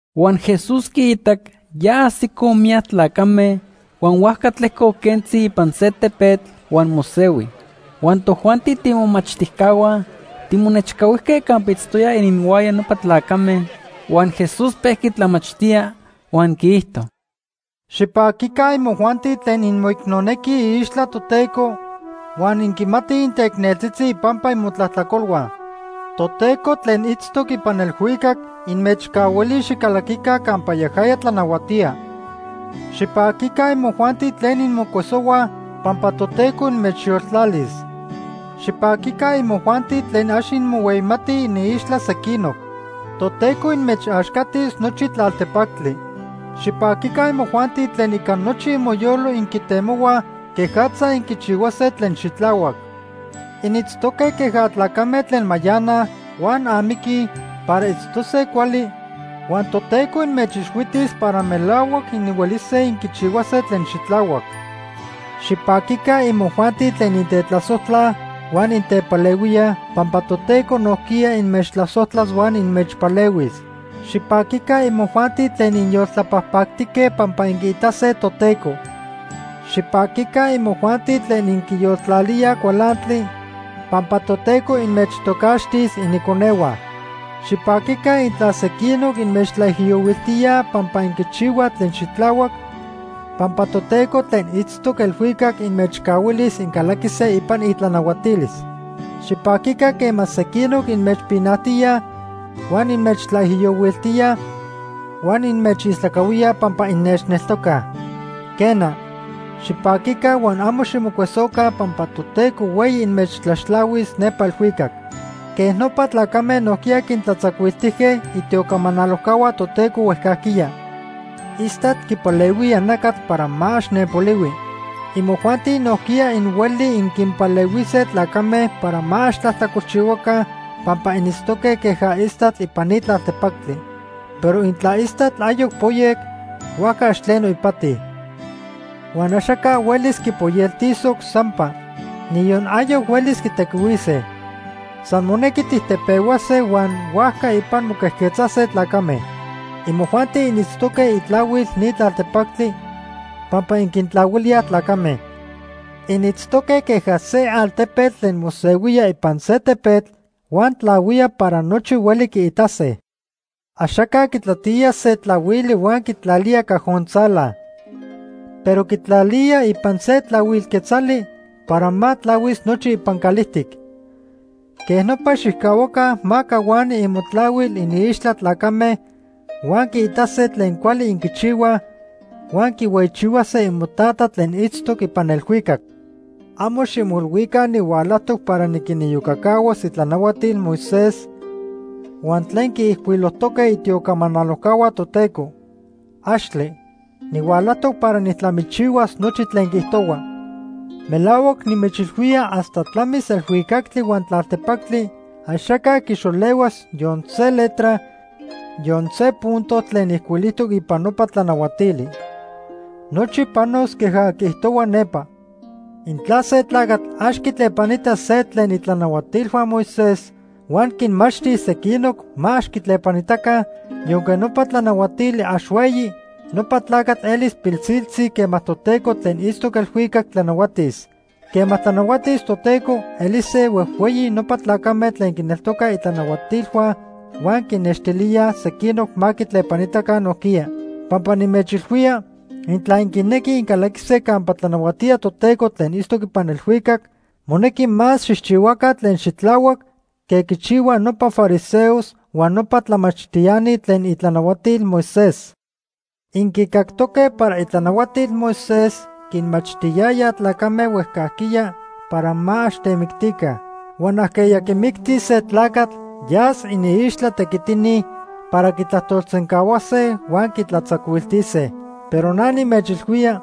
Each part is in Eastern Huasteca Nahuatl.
Huan Jesús quiitac ya ajsicoj miyac tlacame huan huajca tlejcoc quentzi ipan se tepetl huan mosehui. Huan tojuanti tiimomachtijcahua timonechcahuijque campa itztoya ininhuaya nopa tlacame. Huan Jesús pejqui tlamachtía huan quiijto: “Xipaquica imojuanti tlen inmoicnonequij iixtla Toteco, huan inquimatij inteicneltzitzi ipampa imotlajtlacolhua. Toteco tlen itztoc ipan elhuicac inmechcahuilis xicalaquica campa yajaya tlanahuatía. Xipaquica imojuanti tlen inmocuesohuaj, pampa Toteco inmechyoltlalis. Xipaquica imojuanti tlen ax inmohueyimatij iniixtla sequinoc. Toteco inmechaxcatis nochi tlaltepactli. Xipaquica imojuanti tlen ica nochi imoyolo inquitemohuaj quejatza inquichihuase tlen xitlahuac. Initztoque queja tlacame tlen mayanaj huan amiquij para itztose cuali, huan Toteco inmechixhuitis para melahuac inhuelise inquichihuase tlen xitlahuac. Xipaquica imojuanti tlen intetlasojtlaj huan intepalehuíaj, pampa Toteco nojquiya inmechtlasojtlas huan inmechpalehuis. Xipaquica imojuanti tlen inyoltlapajpactique, pampa inquiitase Toteco. Xipaquica imojuanti tlen inquiyoltlalíaj cualantli, pampa Toteco inmechtocaxtis iniconehua. Xipaquica intla sequinoc inmechtlaijiyohuiltíaj pampa inquichihuaj tlen xitlahuac, pampa Toteco tlen itztoc elhuicac inmechcahuilis incalaquise ipan itlanahuatilis. “Xipaquica quema sequinoc inmechpinajtíaj huan inmechtlaijiyohuiltíaj huan inmechistlacahuíaj pampa innechneltocaj. Quena, xipaquica huan amo ximocuesoca pampa Toteco hueyi inmechtlaxtlahuis nepa elhuicac. Quej nopa tlacame nojquiya quintlatzacuiltijque itiocamanalojcahua Toteco huejcajquiya. “Istatl quipalehuía nacatl para ma ax nenpolihui. Imojuanti nojquiya inhuelij inquinpalehuise tlacame para ma ax tlajtlacolchihuaca pampa initztoque queja istatl ipan ni tlaltepactli. Pero intla istatl ayoc poyec, huajca ax tleno ipati. Huan axaca huelis quipoyeltisoc sampa. Niyon ayoc huelis tijtequihuise. San monequi tijtepehuase huan huajca ipan moquejquetzase tlacame. “Imojuanti initztoque itlahuil ni tlaltepactli pampa inquintlahuilíaj tlacame. Initztoque queja se altepetl tlen mosehuía ipan se tepetl huan tlahuía para nochi hueli quiitase. Axaca quitlatía se tlahuili huan quitlalía cajon tzala, pero quitlalía ipan se tlahuil quetzali para ma tlahuis nochi ipan calijtic. Quej nopa xijcahuaca ma cahuani imotlahuil iniixtla tlacame huan quiitase tlen cuali inquichihuaj huan quihueyichihuase imoTata tlen itztoc ipan elhuicac. “Amo ximoilhuica nihualajtoc para niquiniyocacahuas itlanahuatil Moisés huan tlen quiijcuilojtoque itiocamanalojcahua Toteco. ¡Axtle! Nihualajtoc para nijtlamichihuas nochi tlen quiijtohuaj. Melahuac nimechilhuía hasta tlamis elhuicactli huan tlaltepactli axaca quixolehuas yon se letra, yon se punto tlen ijcuilijtoc ipan nopa tlanahuatili. Nochi panos queja quiijtohua nepa. Intla se tlacatl ax quitlepanita se tlen itlanahuatilhua Moisés huan quinmachtis sequinoc ma ax quitlepanitaca, yonque nopa tlanahuatili ax hueyi, nopa tlacatl elis pilsiltzi quema Toteco tlen itztoc elhuicac tlanahuatis. Quema tlanahuatis Toteco, elise huejhueyi nopa tlacame tlen quineltocaj itlanahuatilhua huan quinnextilíaj sequinoc ma quitlepanitaca nojquiya. Pampa nimechilhuía, intla inquinequij incalaquise campa tlanahuatía Toteco tlen itztoc ipan elhuicac, monequi más xijchihuaca tlen xitlahuac que quichihuaj nopa fariseos huan nopa tlamachtiani tlen itlanahuatil Moisés. “Inquicactoque para itlanahuatil Moisés quinmachtiyaya tlacame huejcajquiya para ma ax temictica. Huan ajqueya quimictis se tlacatl yas iniixtla tequitini para quitlajtolsencahuase huan quitlatzacuiltise. Pero na nimechilhuía,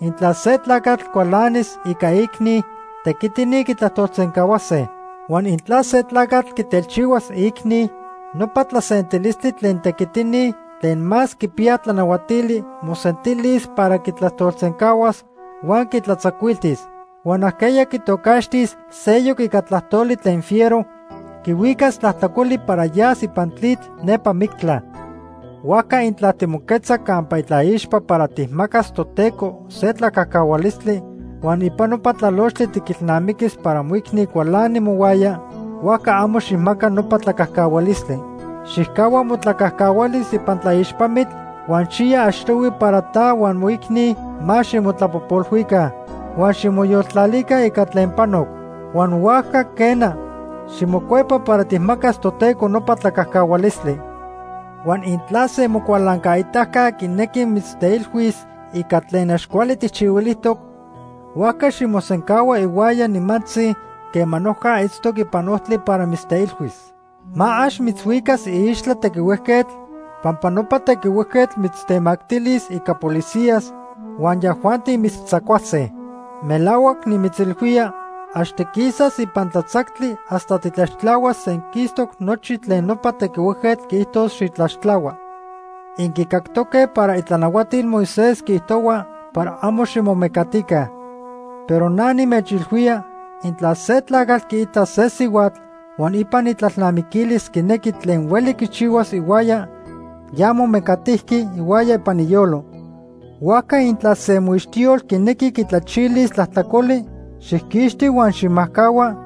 intla se tlacatl cualanis ica iicni, tequitini quitlajtolsencahuase. Huan intla se tlacatl quitelchihuas iicni, nopa tlasentilistli tlen tequitini tlen más quipiyaj tlanahuatili mosentilis para quitlajtolsencahuas huan quitlatzacuiltis. Huan ajqueya quitocaxtis seyoc ica tlajtoli tlen fiero, quihuicas tlajtlacoli para yas ipan tlitl nepa mictla. “Huajca intla timoquetza campa itlaixpa para tijmacas Toteco se tlacajcahualistli huan ipan nopa tlalochtli tiquilnamiquis para moicni cualani mohuaya, huajca amo xijmaca nopa tlacajcahualistli. Xijcahua motlacajcahualis ipan tlaixpamitl huan xiya achtohui para ta huan moicni ma ximotlapojpolhuica huan ximoyoltlalica ica tlen panoc. Huan huajca, quena, ximocuepa para tijmacas Toteco nopa tlacajcahualistli. “Huan intla se mocualancaitaca quinequi mitzteilhuis ica tlen ax cuali tijchihuilijtoc, huajca ximosencahua ihuaya nimantzi quema noja itztoc ipan ojtli para mitzteilhuis. Ma ax mitzhuicas iixtla tequihuejquetl, pampa nopa tequihuejquetl mitztemactilis ica policías huan yajuanti mitztzacuase. Melahuac nimitzilhuía, ax tiquisas ipan tlatzactli hasta titlaxtlahuas senquistoc nochi tlen nopa tequihuejquetl quiijtos xitlaxtlahua. “Inquicactoque para itlanahuatil Moisés quiijtohua para amo ximomecatica. Pero na nimechilhuía, intla se tlacatl quiita se sihuatl huan ipan itlalnamiquilis quinequi tlen hueli quichihuas ihuaya, ya momecatijqui ihuaya ipan iyolo. “Huajca intla se moixtiyol quinequi quitlachilis tlajtlacoli, xijquixti huan xijmajcahua,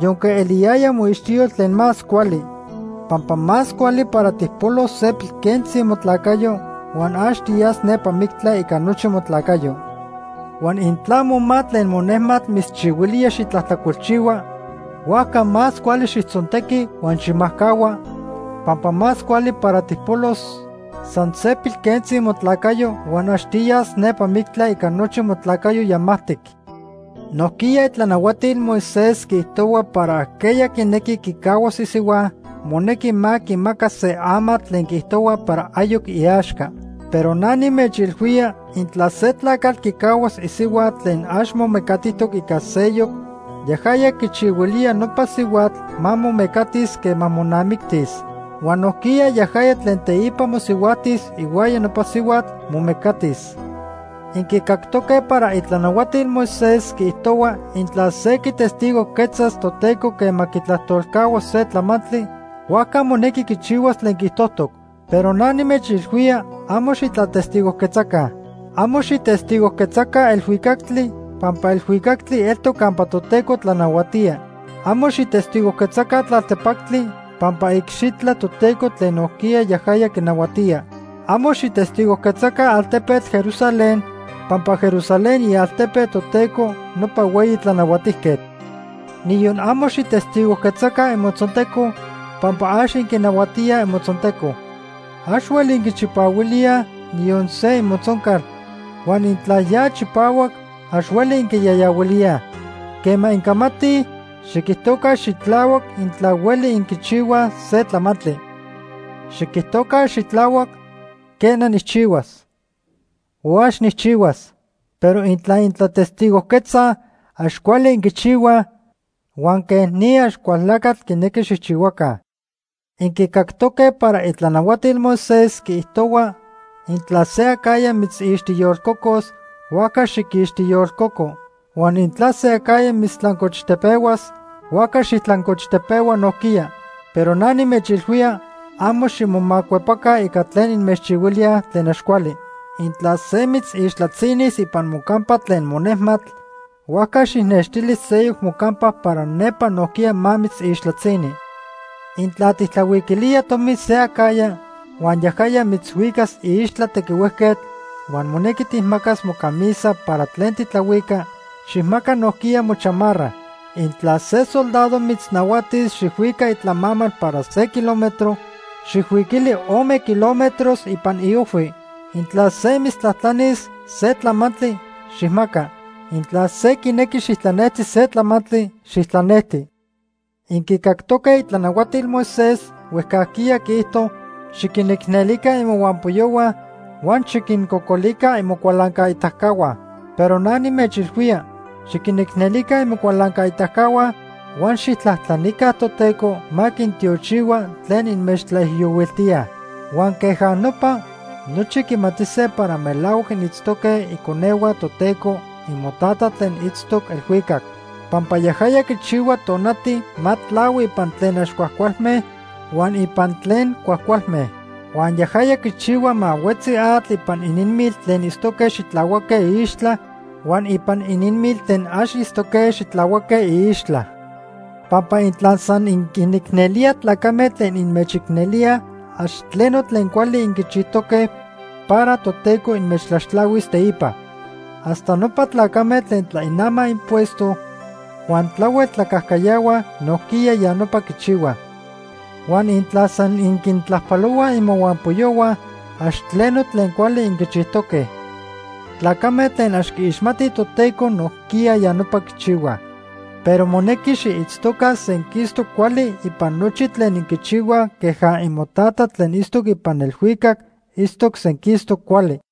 yonque eliyaya moixtiyol tlen más cuali. Pampa más cuali para tijpolos se pilquentzi motlacayo, huan ax tiyas nepa mictla ica nochi motlacayo. Huan intla moma tlen monejmatl mitzchihuilía xitlajtlacolchihua, huajca más cuali xijtzontequi huan xijmajcahua, pampa más cuali para tijpolos san se pilquentzi motlacayo huan ax tiyas nepa mictla ica nochi motlacayo yamajtic. “Nojquiya itlanahuatil Moisés quiijtohua para ajqueya quinequi quicahuas isihua, monequi ma quimaca se amatl tlen quiijtohua para ayoc iaxca. Pero na nimechilhuía, intla se tlacatl quicahuas isihua tlen ax momecatijtoc ica seyoc, yajaya quichihuilía nopa sihuatl ma momecatis quema monamictis. Huan nojquiya yajaya tlen teipa mosihuajtis ihuaya nopa sihuatl, momecatis. “Inquicactoque para itlanahuatil Moisés quiijtohua intla se quitestigojquetzas Toteco quema quitlajtolcahua se tlamantli, huajca monequi quichihuas tlen quiijtojtoc. Pero na nimechilhuía, amo xitlatestigojquetzaca. Amo xijtestigojquetzaca elhuicactli pampa elhuicactli eltoc campa Toteco tlanahuatía. Amo xijtestigojquetzaca tlaltepactli pampa iicxitla Toteco tlen nojquiya yajaya quinahuatía. Amo xijtestigojquetzaca altepetl Jerusalén, pampa Jerusalén ialtepe Toteco nopa Hueyi Tlanahuatijquetl. Niyon amo xijtestigojquetzaca imotzonteco pampa ax inquinahuatíaj imotzonteco. Ax hueli inquichipahuilíaj niyon se imotzoncal, huan intla ya chipahuac, ax hueli inquiyayahuilíaj. Quema incamatij, xiquijtoca xitlahuac intla hueli inquichihuaj se tlamantli. Xiquijtoca xitlahuac ‘quena, nijchihuas’ o ‘ax nijchihuas’, pero intla intlatestigojquetzaj, ax cuali inquichihuaj, huan quej ni Axcualtlacatl quinequi xijchihuaca. “Inquicactoque para itlanahuatil Moisés quiijtohua intla se acajya mitzixtiyolcocos, huajca xiquixtiyolcoco. Huan intla se acajya mitztlancochtepehuas, huajca xijtlancochtepehua nojquiya. Pero na nimechilhuía, amo ximomacuepaca ica tlen inmechchihuilía tlen ax cuali. Intla se mitzixtlatzinis ipan mocampa tlen monejmatl, huajca xijnextili seyoc mocampa para nepa nojquiya ma mitzixtlatzini. Intla tijtlahuiquilía tomi se acajya huan yajaya mitzhuicas iixtla tequihuejquetl huan monequi tijmacas mocamisa para tlen titlahuica, xijmaca nojquiya mochamarra. Intla se soldado mitznahuatis xijhuica itlamamal para se kilómetro, xijhuiquili ome kilómetros ipan iojhui. Intla se mitztlajtlanis se tlamantli, xijmaca. Intla se quinequi xijtlanejti se tlamantli, xijtlanejti. “Inquicactoque itlanahuatil Moisés huejcajquiya quiijto xiquinicnelica imohuampoyohua huan xiquincocolica imocualancaitacahua. Pero na nimechilhuía, xiquinicnelica imocualancaitacahua huan xijtlajtlanica Toteco ma quintiochihua tlen inmechtlaijiyohuiltíaj. Huan queja nopa, nochi quimatise para melahuac initztoque iconehua Toteco imoTata tlen itztoc elhuicac. Pampa yajaya quichihua tonati ma tlahui ipan tlen ax cuajcualme huan ipan tlen cuajcualme. Huan yajaya quichihua ma huetzi atl ipan ininmil tlen itztoque xitlahuaque iixtla huan ipan ininmil tlen ax itztoque xitlahuaque iixtla. Pampa intla san inquinicnelíaj tlacame tlen inmechicnelíaj, ax tleno tlen cuali inquichijtoque para Toteco inmechtlaxtlahuis teipa. Hasta nopa tlacame tlen tlainamaj impuesto huan tlahuel tlacajcayahuaj nojquiya ya nopa quichihuaj. Huan intla san inquintlajpalohuaj imohuampoyohua, ax tleno tlen cuali inquichijtoque. Tlacame tlen ax quiixmatij Toteco nojquiya ya nopa quichihuaj. Pero monequi xiitztoca senquistoc cuali ipan nochi tlen inquichihuaj queja imoTata tlen itztoc ipan elhuicac itztoc senquistoc cuali.